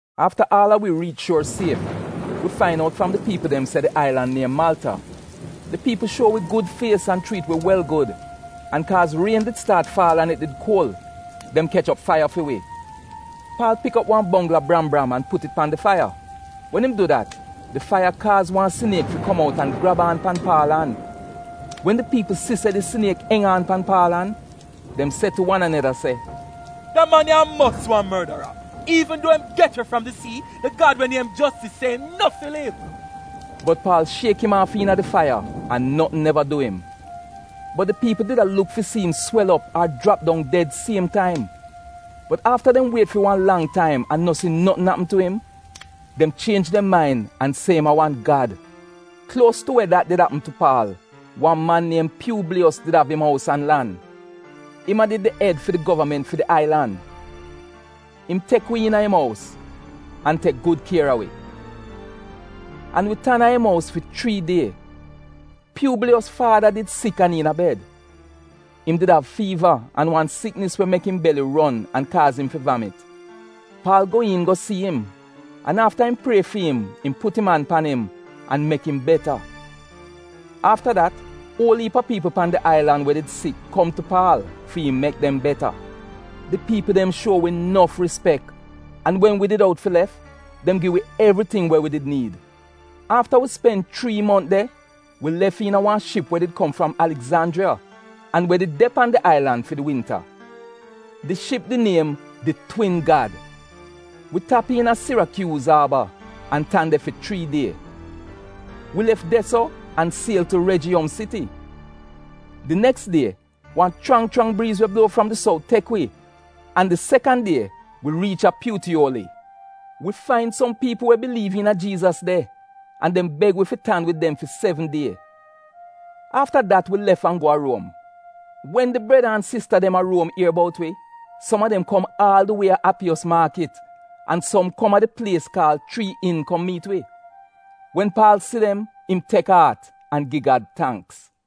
Afta aal a wi riich shuor sief, wi fain out fram di piipl dem se di ailan niem Maalta. Di piipl dem shuo wi gud fies an chriit wi wel gud. An kaaz rien did staat faal an it did kuol, dem kech op faiya fi wi. Paal pik op wan bongl a bram-bram an put it pan di faiya. Wen im du dat, di faiya iit kaaz wan siniek fi kom outa an grab aan pan Paal an. Wen di piipl si se di siniek eng an pan Paal an, dem se tu wan aneda, “Da man ya a mos wan mordara! Iivn duo im get we fram di sii, di gad we niem Jostis se im no fi liv.” Bot Paal shiek im aaf iina di faiya an notn neva du im. Bot di piipl did a luk fi si im swel op ar jrap dong ded siem taim. Bot afta dem wiet fi wan lang taim an no si notn apm tu im, dem chienj dem main an se im a wan gad. Kuos tu we dat did apm tu Paal, wan man niem Pyuubliyos did av im ous an lan. Im a did di ed fi di govament fi di ailan. Im tek wi iin a im ous an tek gud kier a wi. An wi tan a im ous fi chrii die. Pyuubliyos faada did sik an iina bed. Im di av fiiva an wan siknis we mek im beli ron an kaaz im fi vamit. Paal go iin go si im an afta im prie fi im, im put im an pan im an mek im beta. Afta dat uol iip a piipl pan di ailan we did sik kom tu Paal fi im mek dem beta. Di piipl dem shuo wi nof rispek an wen wi did out fi lef, dem gi wi evriting we wi did niid. Afta wi spen chrii mont de, wi lef iina wan ship we did kom fram Aligzanjriya an we did de pan di ailan fi di winta. Di ship di niem “Di Twin Gad.” Wi tap iina Sirakyuus aaba an tan de fi chrii die. Wi lef de-so an siel tu Rejiyom siti. Di neks die wan chrang chrang briiz we bluo fram di sout tek wi an di sekan die wi riich a Pyutiyoli. Wi fain som piipl we biliiv iina Jiizas de an dem beg wi fi tan wid dem fi sevn die. Afta dat wi lef an go a Ruom. Wen di breda an sista dem a Ruom ier bout wi, som a dem kom aal di wie a Apiyos Maakit, an som kom a di plies kaal Chrii In kom miit wi. Wen Paal si dem im tek aat an gi Gad tangks.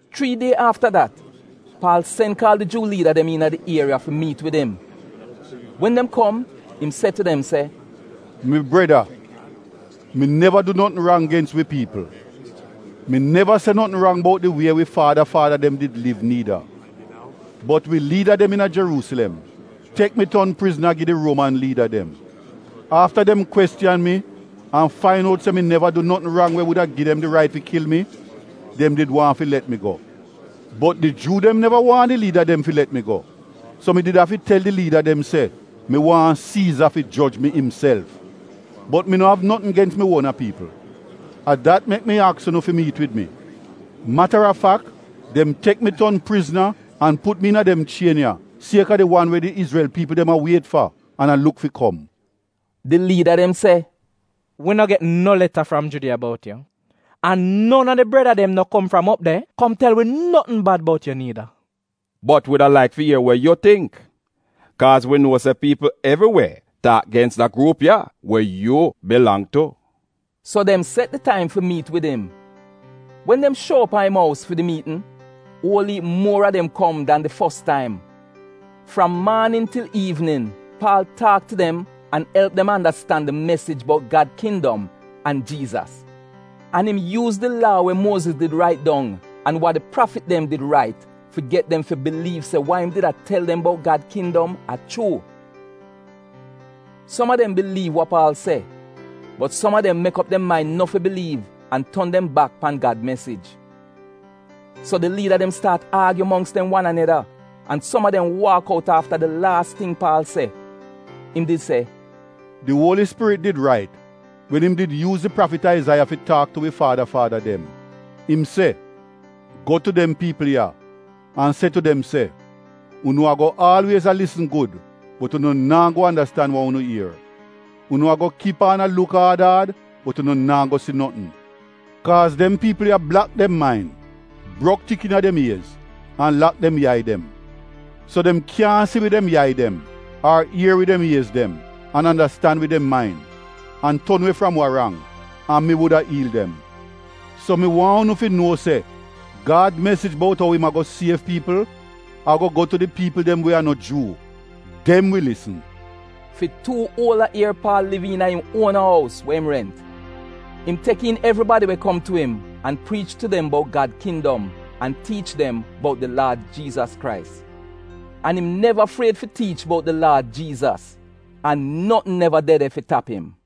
Chrii die afta dat, Paal sen kaal di Juu liida dem iina di ieriya fi miit wid im. Wen dem kom im se tu dem se, “Mi breda, mi neva du notn rang gens wi piipl. Mi neva se notn rang bout di wie wi faada faada dem did liv niida. Bot wi liida dem iina Jeruusilem tek mi ton prizna gi di Ruoman liida dem. Afta dem kwestiyan mi an fain out se mi neva du notn rang we wuda gi dem di rait fi kil mi, dem did waahn fi let mi go. Bot di Juu dem neva waahn di liida dem fi let mi go, so mi did afi tel di liida dem se mi waahn Siiza fi joj mi imself. Bot mi no av notn gens mi uona piipl. A dat mek mi aks unu fi miit wid mi. Mata a fak, dem tek mi ton prizna an put mi iina dem chien ya sieka di wan we di Izrel piipl dem a wiet fa an a luk fi kom.” Di liida dem se, “Wi no get no leta fram Judiya bout yu, an non a di breda dem no kom fram op de kom tel wi notn bad bout yu niida. Bot wi wuda laik fi ier wa yu tingk, kaaz wi nuo se piipl evri we taak gens da gruup ya we yu bilang tu.” So dem set di taim fi miit wid im. Wen dem shuo op a im ous fi di miitn, uol iip muor a dem kom dan di fos taim. Fram maanin til iivnin, Paal taak tu dem an elp dem andastan di mesij bout Gad kindom an Jiizas. An im yuuz di Laa we Muoziz did rait dong, an wa di prafit dem did rait fi get dem fi biliiv se wa im did a tel dem bout Gad kindom a chuu. Som a dem biliiv wa Paal se, bot som a dem mek op dem main no fi biliiv an ton dem bak pan Gad mesij. So di liida dem staat aagyu mongks dem wan aneda an som a dem waak out afta di laas ting Paal se. Im did se, “Di Uoli Spirit did rait wen im did yuuz di prafit Aizaiya fi taak tu wi faada faada dem. Im se, “‘Go tu dem piipl ya an se tu dem se, “Unu ago aalwiez a lisn gud, bot unu naa go andastan wa unu ier. Unu ago kip aan a luk aad aad, bot unu naa go si notn. Kaaz dem piipl ya blak dem main, brok tik iina dem iez, an lak dem yai dem, so dem kyaahn si wid dem yai dem, ar ier wid dem iez dem an andastan wid dem main, an ton we fram wa rang, an mi wuda iil dem.”’ “So mi waahn unu fi nuo se Gad mesij bout ou im ago siev piipl ago go tu di piipl dem we a no Juu. Dem wi lisn!” Fi tuu uola ier Paal liv iina im uona ous we im rent. Im tek iin evribadi we kom tu im an priich tu dem bout Gad kindom an tiich dem bout di Laad Jiizas Krais. An im neva fried fi tiich bout di Laad Jiizas an notn neva de de fi tap im.